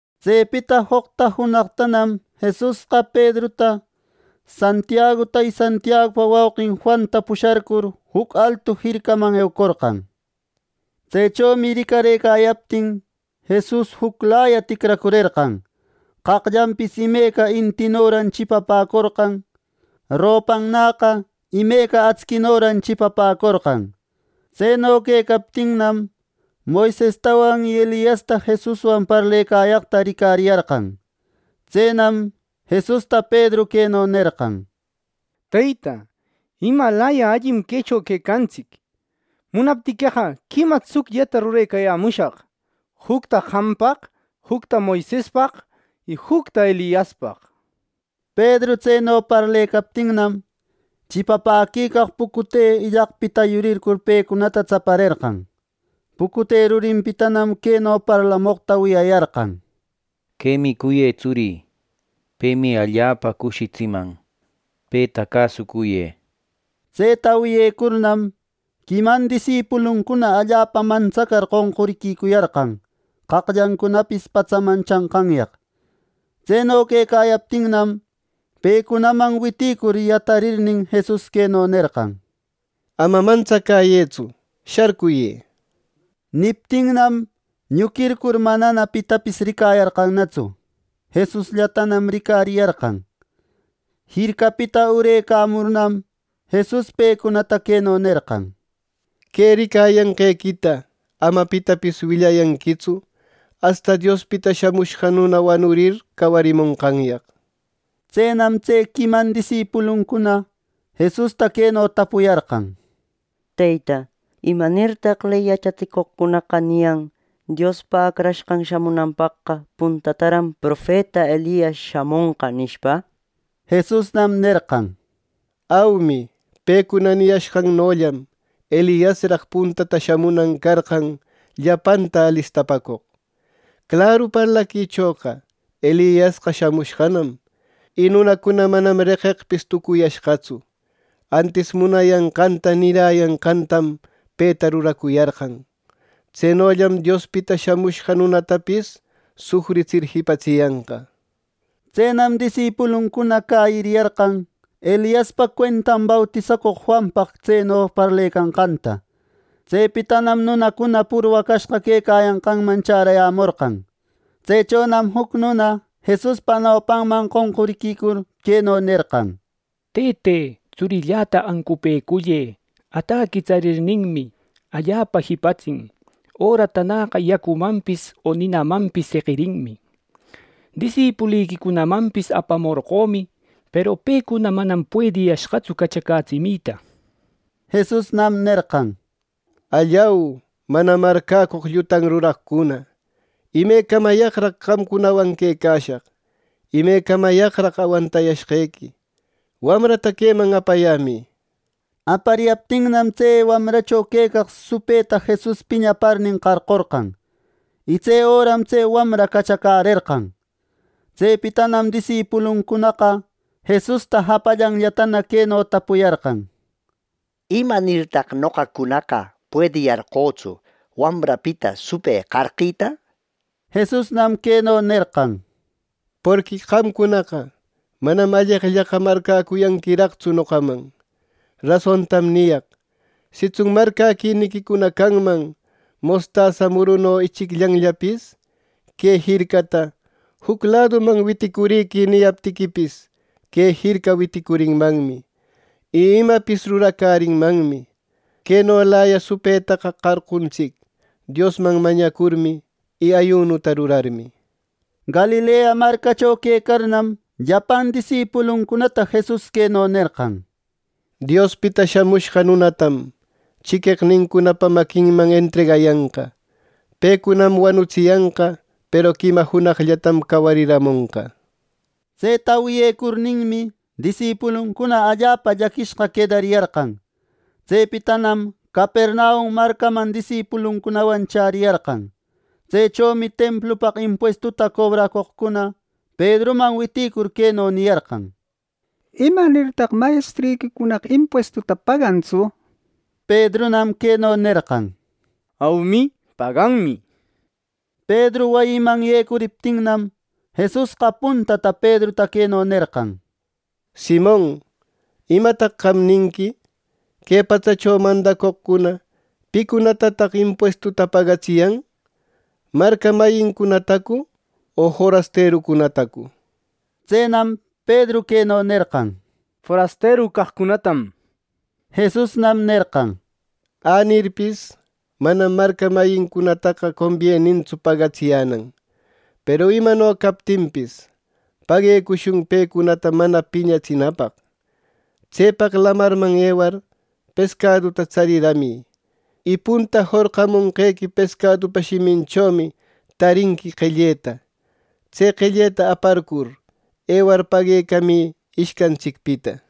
Tsepita joqta junaqtanam Jesusqa Pedruta, Santiaguta y Santiagupa wauqin Juanta pusharcur juc altu jircaman eucorqan. Tsechomi ricarëcayaptin, Jesus juclaya ticracurerqan. Qaqllanpis imeca intinoran chipapäcorqan. Ropannäqa imeca actsinoran chipapäcorqan. Tseno quecaptinnam, Moisesta y Eliasta Jesuswan parlecayaqta ricariyarqan. Tsenam Jesusta Pedru queno nerqan: —Teyta, ¡imalaya allim quecho quecantsic! Munaptiqueqa, quima tsucllata rurecayämushaq: jucta qampaq, jucta Moisespaq y juctana Eliaspaq —nir. Pedru tseno parlecaptinnam, chipapäquicaq pucute illaqpita yurircur pecunata tsaparerqan. Pucute rurinpitanam queno parlamoqta wiyayarqan: —Quemi cuyë tsurï. Pemi allapa cushitsiman. Peta cäsucuyë —nir. Tseta wiyecurnam, quiman disipuluncuna allapa mantsacar qonquriquicuyarqan qaqllancunapis patsaman chanqanyaq. Tseno quecayaptinnam, pecunaman witïcur yatarirnin, Jesus queno nerqan: —Ama mantsacäyëtsu. Sharcuyë —nir. Niptinnam, ñuquircur manana pitapis ricayarqanatsu. Jesusllatanam ricariyarqan. Jircapita urärëcamurnam, Jesus pecunata queno nerqan: —Que ricayanqequita ama pitapis willayanquitsu asta Diospita Shamushqa Nuna wanurir cawarimonqanyaq —nishpa. Tsenam tse quiman disipuluncuna Jesusta queno tapuyarqan: —Teyta, ¿Imanirtaq ley yachatsicoqcunaqa niyan Diospa Acrashqan shamunanpaqqa puntataran profeta Elias shamonqa nishpa? Jesusnam nerqan: —Aumi, pecuna niyashqannollam Eliasraq puntata shamunan carqan llapanta alistapäcoq. Claru parlaquichoqa Eliasqa shamushqanam. Y nunacuna manam reqeqpis tucuyashqatsu, antis munayanqanta niräyanqantam peta ruracuyarqan. Tsenollam Diospita Shamushqa Nunatapis sufritsir jipatsiyanqa. Tsenam disipuluncuna cäyiriyarqan Eliaspa cuentan bautisacoq Juanpaq tseno parlecanqanta. Tsepitanam nunacuna purwacashqa quecayanqanman chärayämorqan. Tsechonam juc nuna Jesuspa nopanman qonquriquicur, queno nerqan: —Tëte, tsurilläta ancupëcullë; ataqui tsarirninmi, allapa jipatsin, öratanäqa yacumanpis o ninamampis seqirinmi. Disipuliquicunamanpis apamorqömi, peru pecuna manam puediyashqatsu cachacätsimita —nir. Jesusnam nerqan: —¡Allau, mana marcäcoq llutan ruraqcuna! ¡Imecamayaqraq qamcunawan quecashaq! ¡Imecamayaqraq awantashqequi! ¡Wamrata queman apayämï! —nir. Apariyaptinnam, tse wamracho quecaq supëta Jesus piñaparnin qarqorqan. Y tse öram tse wamra cachacärerqan. Tsepitanam disipuluncunaqa Jesusta japallanllatana queno tapuyarqan: —¿Imanirtaq noqacunaqa puediyarqötsu wamrapita supë qarqita? —nir. Jesusnam queno nerqan: —Porqui qamcunaqa manam alleqllaqa marcäcuyanquiraqtsu noqaman. Rasontam niyaq: Sitsun marcäquiniquicuna canman mostasa muruno ichicllanllapis; que jircata “Juc laduman witicurï” niyaptiquipis, que jirca witicurinmanmi, y imapis ruracärinmanmi. ˻Quenolaya supëtaqa qarquntsic Diosman mañacurmi y ayunuta rurarmi.˼ Galilea marcacho quecarnam, llapan disipuluncunata Jesus queno nerqan: —Diospita Shamushqa Nunatam chiqueqnincunapa maquinman entregayanqa. Pecunam wanutsiyanqa; peru quima junaqllatam, cawariramonqa —nir. Tseta wiyecurninmi, disipuluncuna allapa llaquishqa quedariyarqan. Tsepitanam Capernaum marcaman disipuluncunawan chäriyarqan. Tsechomi templupaq impuestuta cobracoqcuna Pedruman witïcur queno niyarqan: —¿Imanirtaq mayestriquicunaqa impuestuta pagantsu! —nir. Pedrunam queno nerqan: —Aumi, paganmi —nishpa. Pedru wayiman yecuriptinnam, Jesusqa puntata Pedruta queno nerqan: —Simon, ¿Imataq qam ninqui? ¿Que patsacho mandacoqcuna picunatataq impuestuta pagatsiyan? ¿Marca mayincunatacu o forasterucunatacu? Tsenam Pedru queno nerqan: —Forasteru caqcunatam —nir. Jesusnam nerqan: —Änirpis, manam marca mayincunataqa combienintsu pagatsiyänan. Peru imano captinpis, paguecushun pecunata mana piñatsinapaq. Tsepaq lamarman ewar pescaduta tsariramï, y punta jorqamonqequi pescadupa shiminchomi tarinqui qelleta. Tse qelleta aparcur ewar paguecamï ishcantsicpita.